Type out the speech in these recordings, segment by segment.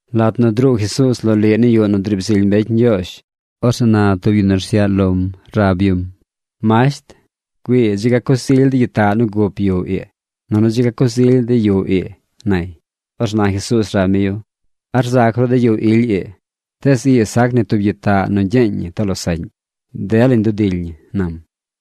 Lat nu druu Jesuuz loliꞌ ni yuꞌ nu driib zily mbecy Ñgyoozh, orzeꞌ na tub yu nu rsyaꞌ lom rab yum: ―¡Masht, güii dzi ga coz ily de gyitaꞌ nu gup yuꞌ ii, nunu dzi ga coz ily de yuꞌ ii! ―nay. Orzeꞌ na Jesuuz rab mi yu: ―¿A rzac ru de yuꞌ ily ii? Tees ii sac ni tub gyitaꞌ nu gyeeñ ñi too losaꞌñ. Delañ dudily ñi ―nam.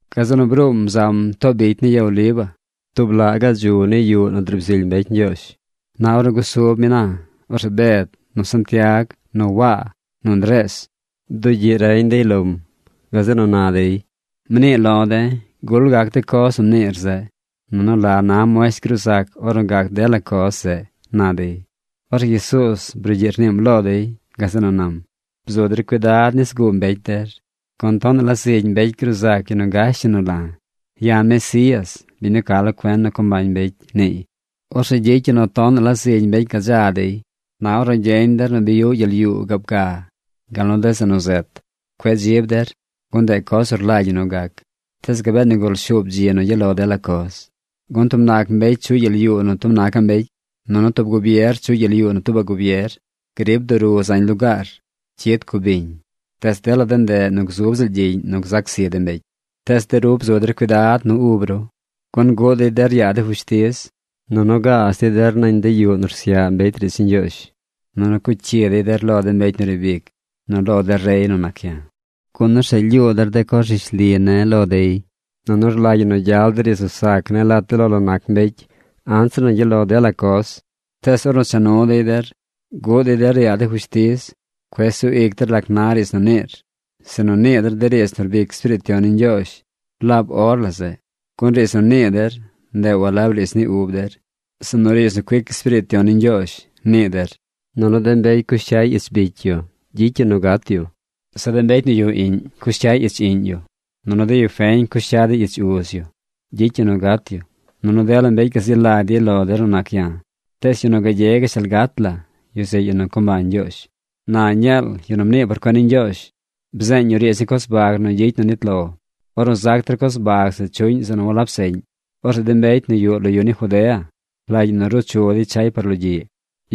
Gazeꞌ nu bruum zam too bicy ni ya Oliva, tub laꞌ gaꞌ dzu ni yuꞌ nu driib zily mbecy Ñgyoozh. Na ornu gusub mi na, orzeꞌ Bed, nu Santiag, nu Waa, nu Ndrees, bdugyiꞌ reñ dey lom. Gazeꞌ nu na dey: ―Mnii lo̱ de̱, ¿gul gac de coz nu mniir zeꞌ? Nunu ¿la na muesht gruu zac ornu gac dela coz zeꞌ? ―na dey. Orzeꞌ Jesuuz brugyiꞌ rniim lo dey. Gazeꞌ nu nam: ―Bzu der cuidad nis guu mbecy der, gun tonaꞌ la zigy mbecy gruu zac yu nu gash yu nu la̱. “Ya̱ Mesías, biñ nu ca lo cuen nu co mbañ mbecy”, niiy. Orzeꞌ gyicy yu nu tonaꞌ la zigy mbecy gadza dey. ’Na ornu gyeñ der nu bi yuꞌ gyel yuu gaab ga gal nu de zeꞌ nu zet, cueꞌ dzib der, gun ndeꞌ coz nu rlagy ñi nu gac. Tees gabee nigul shuub dzi nu gyaꞌ lo dela coz. Gun tub nac mbecy chuꞌy gyel yuu nu tub nacaꞌ mbecy. Nunu tub gubier chuꞌy gyel yuu nu tuubaꞌ gubier. Grib duru zañ lugaar. Cyid cubiñ. Tees dela de ndeꞌ nu gzub ziꞌl gyiꞌñ nu gzac zi de mbecy. ’Tees de ru bzu der cuidad nu ub ru, gun guꞌ dey der yaa de fushtiz. Nunu gaaz dey der nañ de yuꞌ nu rsyaꞌ mbecy riidz ni Ñgyoozh. Nunu cuꞌ cyi dey der lo de mbecy nu riib ic nu lo de rey nu nac ya̱, gun orzeꞌ lyuu der de coz rishli ne̱ lo dey. Nunu rlagy ñi nu gyal de riidz nu sac ne̱ lat de lo la nac mbecy anzir nu gyaꞌ lo dela coz. Tees ornu cha nu dey der guꞌ dey der yaa de fushtiz, cueꞌ sug ic der lac na riidz nu niir, sinu nii der de riidz nu rbic Espiriit Yon ni Ñgyoozh laab or la zeꞌ, gun riidz nu nii der, ndeꞌ walab riidz ni ub der, sinu riidz nu cuic Espiriit Yon ni Ñgyoozh, nii der. Nunu de mbecy cush cyay ich bicy yu gyicy yu nu gat yu. Zeꞌ de mbecy nu yuꞌ iꞌñ cush cyay ich iꞌñ yu. Nunu de yu feñ cush cya dey ich uz yu. Gyicy yu nu gat yu. Nunu dela mbecy gazi lagy dey lo der nu nac ya̱. Tees yu nu gagye gashtal gat la, yu zeꞌ yu nu co mbañ Ñgyoozh. ’Na Dañeel, yu nu mnii por cuen ni Ñgyoozh, bzeeñ yu riidz ni coz bag nu gyicy nu nit lo. Ornu zac der coz bag zeꞌ chuꞌñ zeꞌ nu walab seꞌñ, orzeꞌ de mbecy nu yuꞌ lo yu ni Judea rlagy ñi ruu chu dey chay par logyiꞌ.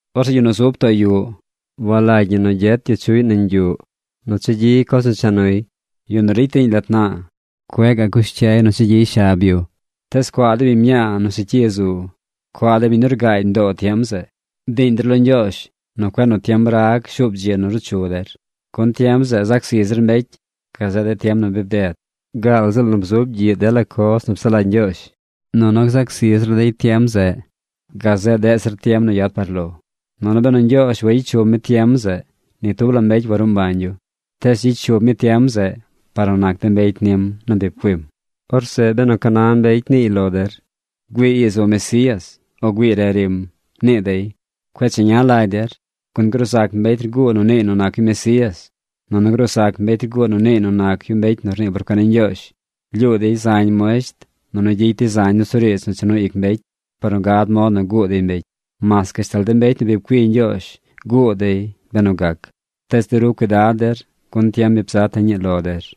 Orzeꞌ yu nu zub too yuꞌ, walagy ñi nu gyet yu chuꞌy nañ yuꞌ nu chagyiy coz nu cha nuy. Yu nu ricy riiñ lat naa, cueꞌ gaꞌ cush cyay cha gyiy shab yu. ¡Tees cuaa de biñ mñaa nu secyi zu! ¡Cuaa de biñ nu rgaagy mdoo tiem zeꞌ! Bdiiñ der lo Ñgyoozh nu cueꞌ nu tiem rag shuub dzi nu ruu chu der. Gun tiem zeꞌ zac zi zir mbecy gazeꞌ de tiem nu bded, gaal ziꞌl nu bzub gyiꞌ dela coz nu psaꞌ lagy Ñgyoozh. Nunu gzac zi zir dey tiem zeꞌ gazeꞌ deꞌ zir tiem nu yad par lo. Nunu benu Ñgyoozh wayicy shub mi tiem zeꞌ, ni tub la mbecy waruu mbañ yu. Tees gyicy shub mi tiem zeꞌ par nu nac de mbecy nim nu bi pcuim. ’Orzeꞌ benu ca na mbecy niiy lo der: “Güii ii zu Mesías, o güii re rim”, nii dey, cueꞌ cheña lagy der. Gun gruu zac mbecy rguu nu niiy nu nac yu Mesías nunu gruu zac mbecy rguu nu niiy nu nac yu mbecy nu rnii por cuen ni Ñgyoozh. Lyuu dey zañ muesht, nunu gyicy dey zañ nusuriidz nu cha nu ic mbecy par nu gad mod nu guu dey mbecy. Mas gashtal de mbecy nu bi pcui Ñgyoozh guu dey benu gac. ¡Tees de ru cuidad der! Gun tiem bi bzata̱ ñii lo der.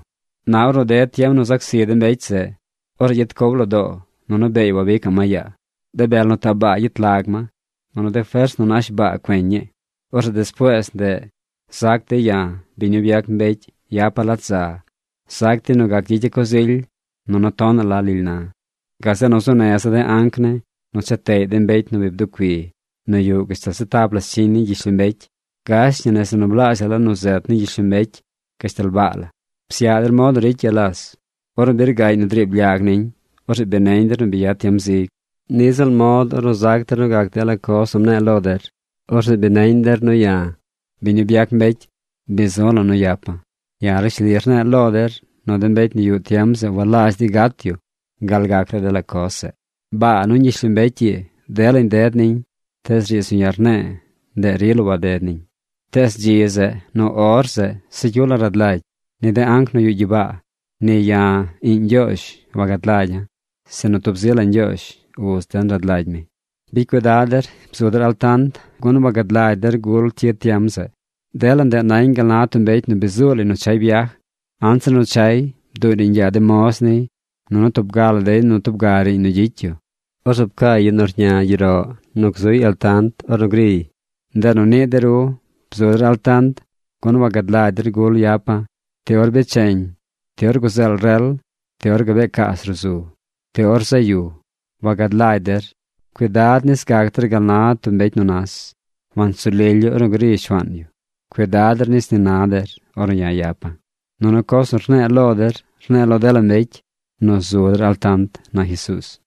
’Na ornu ded tiem nu zac zi de mbecy zeꞌ, orzeꞌ gyet cow lo doo nunu beey wabicaꞌ ma yaa. De bel nu taꞌ baa gyet lag ma, nunu de fers nu nash baa cueñ ñii. Orzeꞌ despuees ndeꞌ zac dey ya̱, biñ nu byac mbecy, yapa̱ lat za. Zac dey nu gac gyicya̱ coz ily nunu tonaꞌ la lily na̱. Gazeꞌ nu zuu neza̱ de anc ne̱ nu cha teꞌy de mbecy nu bi bducui nu yuꞌ gashtal se tap la scyiñ ni gyishlombecy: gash ñi nese zeꞌ nu blaazhaꞌ la nu zet ni gyishlombecy gashtal baa la. ’Psyaꞌ der mod nu ricy ya las. Ornu bi rgaꞌñ nu driib lyag niñ, orzeꞌ bi neñ der nu bi yad tiem zig. Niꞌ ziꞌl mod ornu zac der nu gac dela coz nu mne̱e̱ lo der, orzeꞌ bi neñ der nu ya̱, biñ nu byac mbecy, bi zu̱ la̱ nu yapa̱. Ya̱ rishli rne̱e̱ lo der nu de mbecy nu yuꞌ tiem zeꞌ walazh dey gat yu gal gac dela coz zeꞌ. Baa nuñ gyishlombecy ii, delañ ded niñ, tees riidz nu ya̱ rne̱e̱, ndeꞌ rila waded niñ. ’Tees dzi zeꞌ, nu or zeꞌ, se cyu la rad lagy. Ni de anc nu yuꞌ gyibaa, ni ya̱, iꞌñ Ñgyoozh, wagad lagya̱, sinu tub zi la Ñgyoozh, uz den rad lagy mi. ’Bicy cuidad der. Bzu der altant, gun wagad lagy der gul cyid tiem zeꞌ. Dela ndeꞌ nañ gal na tub mbecy nu bi zuu lay nu chay byaj. Anzir nu chay, bduꞌy riiñ yaa de moz niy, nunu tub ga la dey nu tub ga riiñ nu gyicy yu. Orzeꞌ pcaay yu nu rña gyeroꞌ nu zuy altant par ornu griy. Ndeꞌ nu ni de ru bzu der altant, gun wagad lagy der gul yapa̱: ti or bi becheñ, ti or guzeel rel, ti or gabee caas ruꞌ zu, ti or zaꞌ yu. Wagad lagy der. Cuidad nis gac der gal na tub mbecy nu nas. Wansu lily yu ornu gri shuaan yu. Cuidad der nis ni na der ornu ya̱ yapa̱. Nunu coz nu rne̱e̱ lo der, rne̱e̱ lo dela mbecy: nu zu der altant ―na Jesuuz.